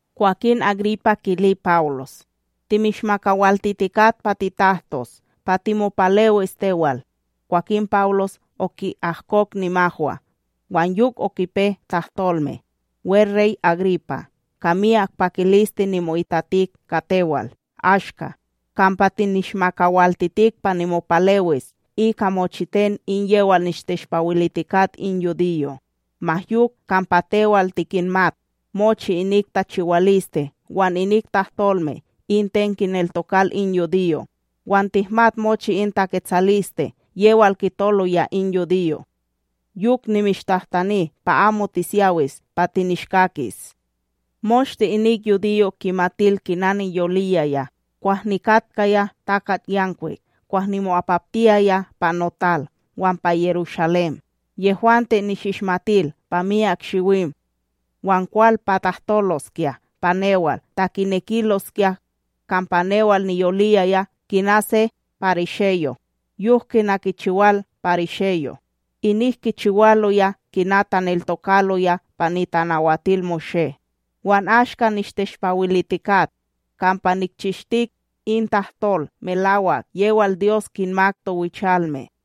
Kwakin Agripa kili Pawlos: —Timishmakawaltitikat pa titahtos, pa timopalewis tewal. Kwakin Pawlos oki'ahkok nimahwa, wan yok okipe tahtolme: —WeRey Agripa, ka miyak pakiliste nimo'itatik ka tewal ashka kampa tinishmakawiltitik pa nimopalewis ika mochiten in yewal nishteshpawilitikat in yudiyo', ma yok kampa tewal tikinmat mochi inik tachiwaliste wan inik tahtolme in ten kinneltokal in yudiyo' wan tihmat mochi in taketsaliste yewal kitoloya in yudiyo'. Yok nimishtahtani pa amo tisyawis pa tinishkakis. ’Moshte in yudiyo' kimatil kina niyoliyaya kwah nikatkaya takatYanwik kwah nimo'apaptiyaya pa notal wan pa Yerushalém. Yehwante nishishmatil pa miyak shiwim, wan kwal pa tahtoloskya pa newal ta kinekiloskya, kampa newal niyoliyaya kina se pariseyo, yok kina kichiwal parisheyo' inik kichiwaloya kina taneltokaloya pa NitanawatilMoshé. Wan ashka nishteshpawilitikat, kampa nikchishtik, in tahtol melawak yewal Dyos kinmak towichalme.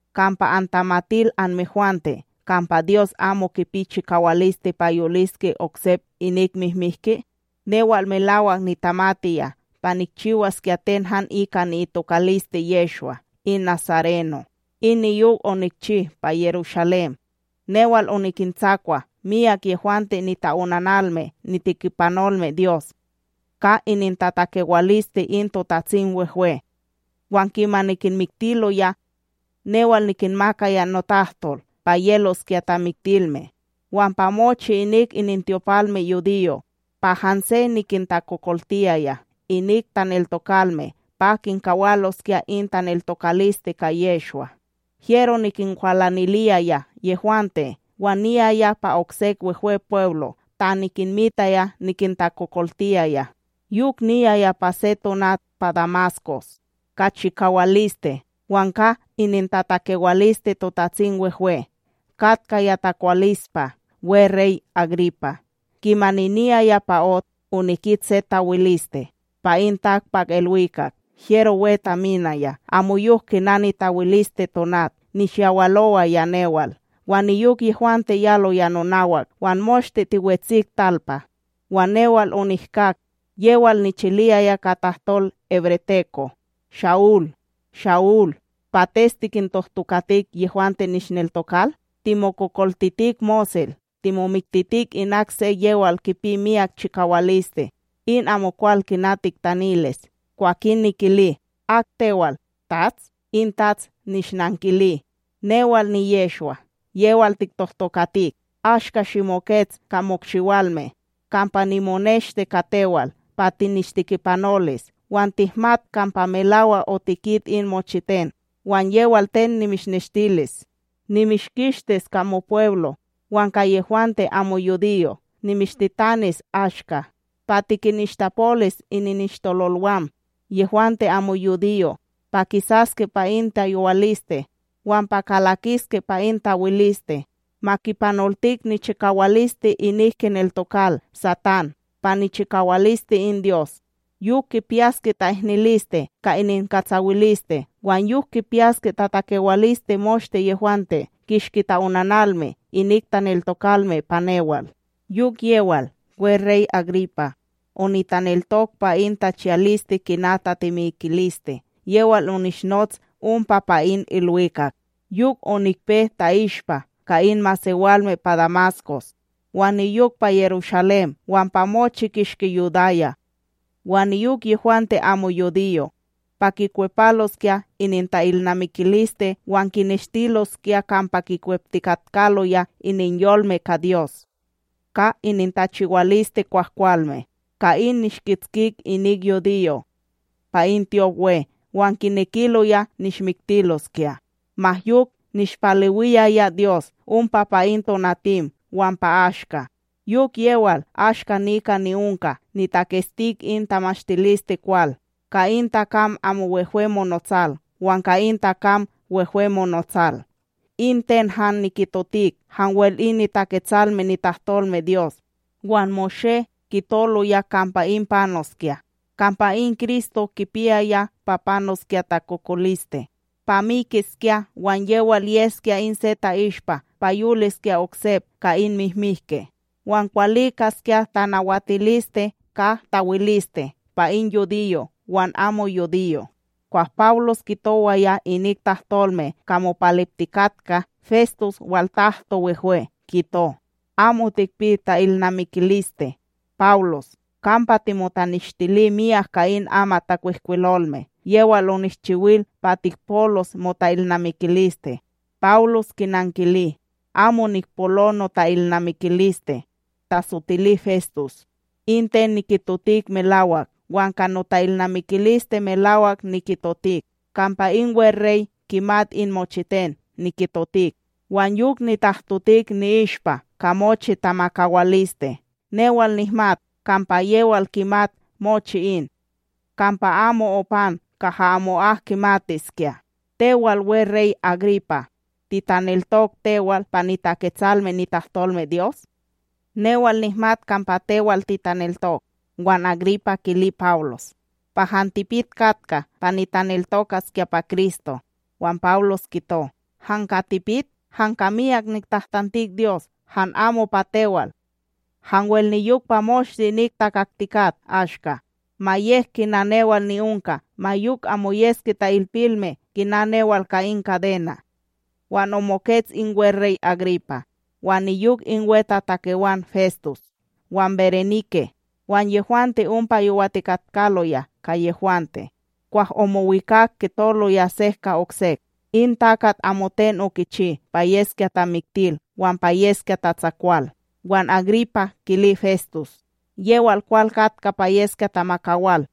Kampa antamatil anmehwante kampa Dyos amo kipi chikawaliste pa yoliske oksep inik mihmihki? ’Newal melawak nitamatiya pa nikchiwaskya ten han ika ni'itokaliste Yehshwa in nasareno, in niyok onikchi pa Yerushalém, newal onikintsakwa miyak yehwante nita'onanalme nitekipanolme Dyos, ka inintatakewaliste in TotatsimWehwe, wan kimani kinmiktiloya, newal nikinmakaya notahtol pa yeloskya tamiktilme. Wan pa mochi inik inintyopalmeYudiyo' pa hanse nikintakokoltiyaya inik taneltokalme pa kinkawaloskya in taneltokaliste ka Yehshwa, hyero nikinkwalaniliyaya yehwante wan niyaya pa oksek Wehwepweblo' ta nikinmitaya nikintakokoltiyaya. ’Yok niyaya pa se tonat pa Damaskos, ka chikawaliste wan ka inintatakewaliste TotatsimWehwe. Katkaya takwalispa, weRey Agripa, kimani niyaya pa ot, onikit se tawiliste pa in takpakIlwikak hyero we taminaya amoyok kina nitawiliste tonat, nishyawalowaya newal wan niyok yehwante yaloya nonawak. Wan moshte tiwetsik talpa, wan newal onihkak yewal nichiliyaya ka tahtol hebreteko: “Sha'ul, Sha'ul, pates tikintohtokatik yehwante nishneltokal? Timokokoltitik mosel, timomiktitik inak se yewal kipi miyak chikawaliste in amokwal kina tiktanilis.” Kwakin nikili: “Ak tewal, TATS?” In Tats nishnankili: “Newal niYehshwa, yewal tiktohtokatik. Ashka shimokets ka mokshiwalme, kampa nimoneshti ka tewal pa tinishtekipanolis wan tihmat kampa melawak otikit in mochiten wan yewal ten nimishneshtilis. Nimishkistis ka mopweblo wan ka yehwante amo yudiyo' nimishtitanis ashka. pa tikinishtapolis ininishtololwam, yehwante amo yudiyo' pa kisaske pa in tayowaliste wan pa kalakiske pa in tawiliste, ma kipanoltik nichikawaliste inik kineltokal Satán pa nichikawaliste in Dyos, yok kipiyaske ta'ihniliste ka ininkatsawiliste wan yok kipiyaske takawaliste moshte yehwante kishki ta'onanalme inik taneltokalme pa newal.” ’Yok yewal, weRey Agripa, onitaneltok pa in tachiyaliste kina tatemikiliste yewal onishnots ompa pa in ilwikak, yok onikpe ta'ishpa ka in masewalme pa Damaskos, wan niyok pa Yerushalém wan pa mochi kishki Yudaya, wan niyok yehwante amo yudiyo', pa kikwepaloskya ininta'ilnamikiliste wan kineshtiloskya kampa kikweptikatkaloya ininyolme ka Dyos, ka inintachiwaliste kwahkwalme. Ka in nishkitskik inik yudiyo' pa in tyopWe wan kinekiloya nishmiktiloskya. Ma yok nishpalewiyaya Dyos ompa pa in tonatim wan pa ashka, yok yewal ashka nika ni'onka nitakestik in tamashtilisteKwal, ka in takam amo wehwe monotsal wan ka in takam wehwe monotsal. In ten han nikitotik hanwel in niTaketsalme nitahtolmeDyos wan Moshé kitoloya kampa in panoskya, kampa in Kristo kipiyaya pa panoskya takokoliste, pa mikiskya wan yewal yeskya in se ta'ishpa pa yoliskya oksep ka in mihmihke, wan kwalikaskya tanawatiliste ka tawiliste pa in yudiyo' wan amo yudiyo'. Kwah Pawlos kitowaya inik tahtolme ka mopaleptikatka, Festus waltahtoWehwe, kito: —Amo tikpi ta'ilnamikiliste, Pawlos! Kampa timotaneshtili miyak ka in amatTakwihkwilolme yewal onishchiwil pa tikpolos mota'ilnamikiliste. Pawlos kinankili: —Amo nikpolo nota'ilnamikiliste, tasotili Festus; in ten nikitotik melawak wan ka nota'ilnamikiliste melawak nikitotik. Kampa in weRey kimat in mochiten nikitotik wan yok nitahtotik ni'ishpa ka mochi tamakawaliste. Newal nihmat kampa yewal kimat mochi in, kampa amo opan kaha amo'ak kimatiskya. Tewal, weRey Agripa, titaneltok tewal pa niTaketsalme nitahtolmeDyos? Newal nihmat kampa tewal titaneltok. Wan Agripa kili Pawlos: —Pa han tipit katka pa nitaneltokaskya pa Kristo. Wan Pawlos kito: —Han ka tipik, han ka miyak niktahtantik Dyos han amo pa tewal, hanwel niyok pa moshte inik takaktikat ashka, ma yek kina newal ni'onka, ma yok amo yeske ta'ilpilme kina newal ka in kadena'. Wan omokets in weRey Agripa, wan niyok in wetatakewan Festus, wan Berenike wan yehwante ompa yowatikatkaloya ka yehwante, kwah omowikak kitoloya sek ka oksek: —In takat amoten okichi pa yeskya tamiktil, wan pa yeskya tatsakwal. Wan Agripa kili Festus: —Yewal kwal katka pa yeskya tamakawal,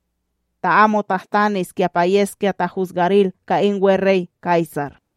ta amo tahtaniskya pa yeskya tahusgaril ka in weRey Kaysar.